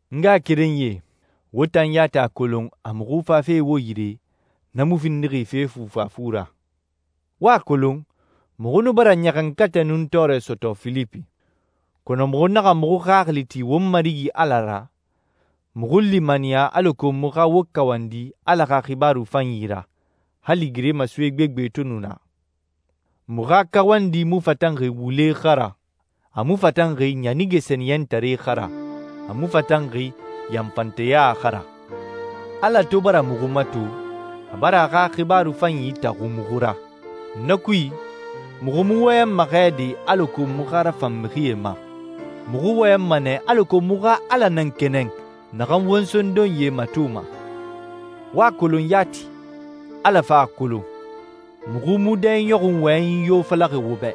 N ngaxakerenyie, wo tan yati a kolon a muxu fafe wo yire na mu findixi fe fufafu ra. Wo a kolon, muxu nu bara ɲaxankatɛ nun tɔɔrɛ sɔtɔ Filipi. Kɔnɔ muxu naxa muxu xaxili ti won Marigi Ala ra, muxu limaniya alako muxu xa wo kawandi Ala xa xibaaru fanyi ra, hali geremasoe gbegbe to nu naa. Muxu xa kawandi mu fatanxi wule xa ra, a mu fatanxi ɲanige sɛniyɛntare xa ra, a mu fatanxi yanfanteya xa ra. Ala to bara muxu mato, a bara a xa xibaaru fanyi taxu muxu ra. Na kui, muxu mu wɔyɛnma xɛ de alako muxu xa rafan mixie ma. Muxu wɔyɛnma nɛ alako muxu xa Ala nan kɛnɛn naxan won sondonyie matoma. Wo a kolon yati, Ala fan a kolon, muxu mu dɛiɲɔxunyi wɔyɛnyi yo falaxi wo bɛ.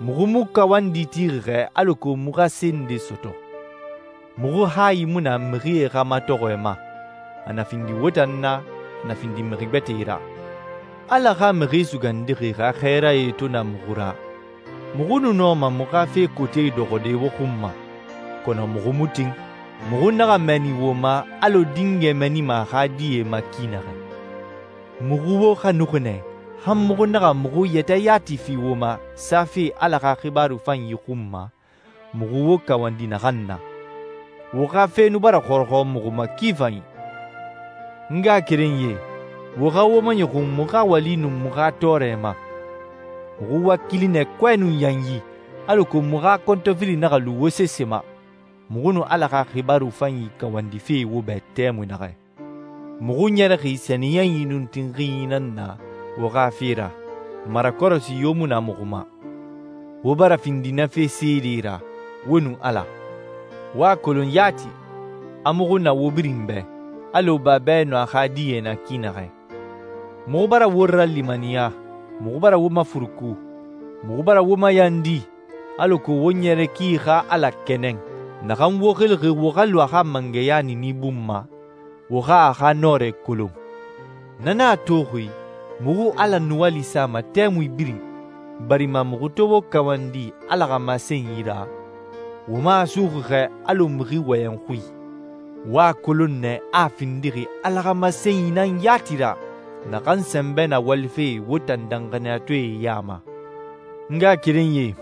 Muxu mu kawandi tixi xɛ alako muxu xa se nde sɔtɔ. Muxu hayi mu na mixie xa matɔxɔɛ ma, a na findi wo tan na, a na findi mixi gbɛtɛe ra. Ala xa Mixi Sugandixi xa xɛɛrae to na muxu ra, muxu nu nɔma muxu xa fe kote dɔxɔde wo xun ma, kɔnɔ muxu mu tin. Muxu naxa mɛɛni wo ma, alɔ dingɛ mɛɛnima a xa die ma ki naxɛ. Muxu wo xanuxi nɛ han muxu naxa muxu yɛtɛ yati fi wo ma safe Ala xa xibaaru fanyi xun ma muxu wo kawandi naxan na. Wo xa fe nu bara xɔrɔxɔ muxu ma ki fanyi. N ngaxakerenyie, wo xa wo maɲɔxun muxu xa wali nun muxu xa tɔɔrɛ ma. Muxu wakili nɛ kɔɛ nun yanyi alako muxu xa kɔntɔfili naxa lu wo sese ma, muxu nu Ala xa xibaaru fanyi kawandife wo bɛ tɛmui naxɛ. Muxu ɲɛrɛxi sɛniyɛnyi nun tinxinyi nan na wo xa fe ra, marakɔrɔsi yo mu na muxu ma. Wo bara findi na fe seedee ra, wo nun Ala. Wo a kolon yati, a muxu na wo birin bɛ, alɔ babɛ nun a xa die na ki naxɛ. Muxu bara wo ralimaniya, muxu bara wo mafuruku, muxu bara wo mayandi alako wo ɲɛrɛ ki xa Ala kɛnɛn, naxan wo xilixi wo xa lu a xa mangɛya niini bun ma, wo xa a xa nɔrɛ kolon. Na nan a toxi muxu Ala nuwali sama tɛmui birin barima muxu to wo kawandi Ala xa masenyi ra, wo mu a suxuxi xɛ alɔ mixi wɔyɛn xui. Wo a kolon nɛ a a findixi Ala xa masenyi nan yati ra naxan sɛnbɛ na walife wo tan danxaniyatɔɛe ya ma. N ngaxakerenyie,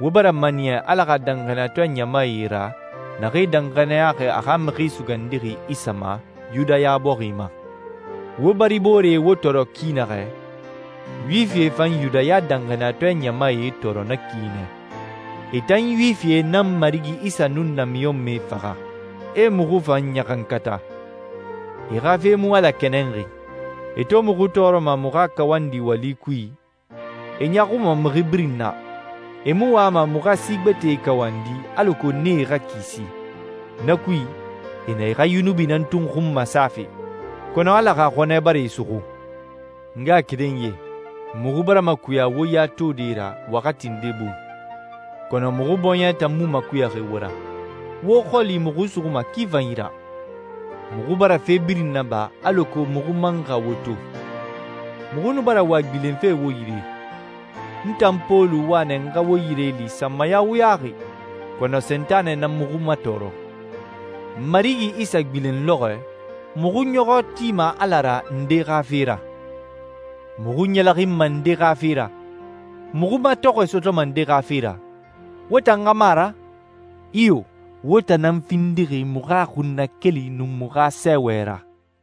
wo bara maniya Ala xa danxaniyatɔɛ ɲamae ra naxee danxaniyaxi a xa Mixi Sugandixi Isa ma Yudaya bɔxi ma. Wo baribooree wo tɔɔrɔ ki naxɛ, Yuwifie fan Yudaya danxaniyatɔɛ ɲamae tɔɔrɔ na ki nɛ. E tan Yuwifie nan Marigi Isa nun namiɲɔnmɛe faxa, e muxu fan ɲaxankata. E xa fe mu Ala kɛnɛnxi. E to muxu tɔɔrɔma muxu xa kawandi wali kui, e ɲaaxuma mixi birin na. E mu wama muxu xa si gbɛtɛe kawandi alako nee xa kisi. Na kui, e na e xa yunubi nan tun xun masafe. Kɔnɔ Ala xa xɔnɛ bara e suxu. N ngaxakerenyie, muxu bara makuya wo ya tode ra waxati nde bun, kɔnɔ muxu bɔɲɛ tan mu makuyaxi wo ra. Wo xɔli muxu suxuma ki fanyi ra. Muxu bara fe birin naba alako muxu man xa wo to. Muxu nu bara wa gbilenfe wo yire. N tan Pɔlu wa nɛ n xa wo yire li sanmaya wuyaxi, kɔnɔ Sentanɛ nan muxu matɔɔrɔ. Marigi Isa gbilen lɔxɔɛ, muxu ɲɔxɔ tima Ala ra nde xa fe ra? Muxu ɲɛlɛxinma nde xa fe ra? Muxu matɔxɔɛ sɔtɔma nde xa fe ra? Wo tan xa mu a ra? Iyo, wo tan nan findixi muxu xa xunnakeli nun muxu xa sɛɛwɛ ra.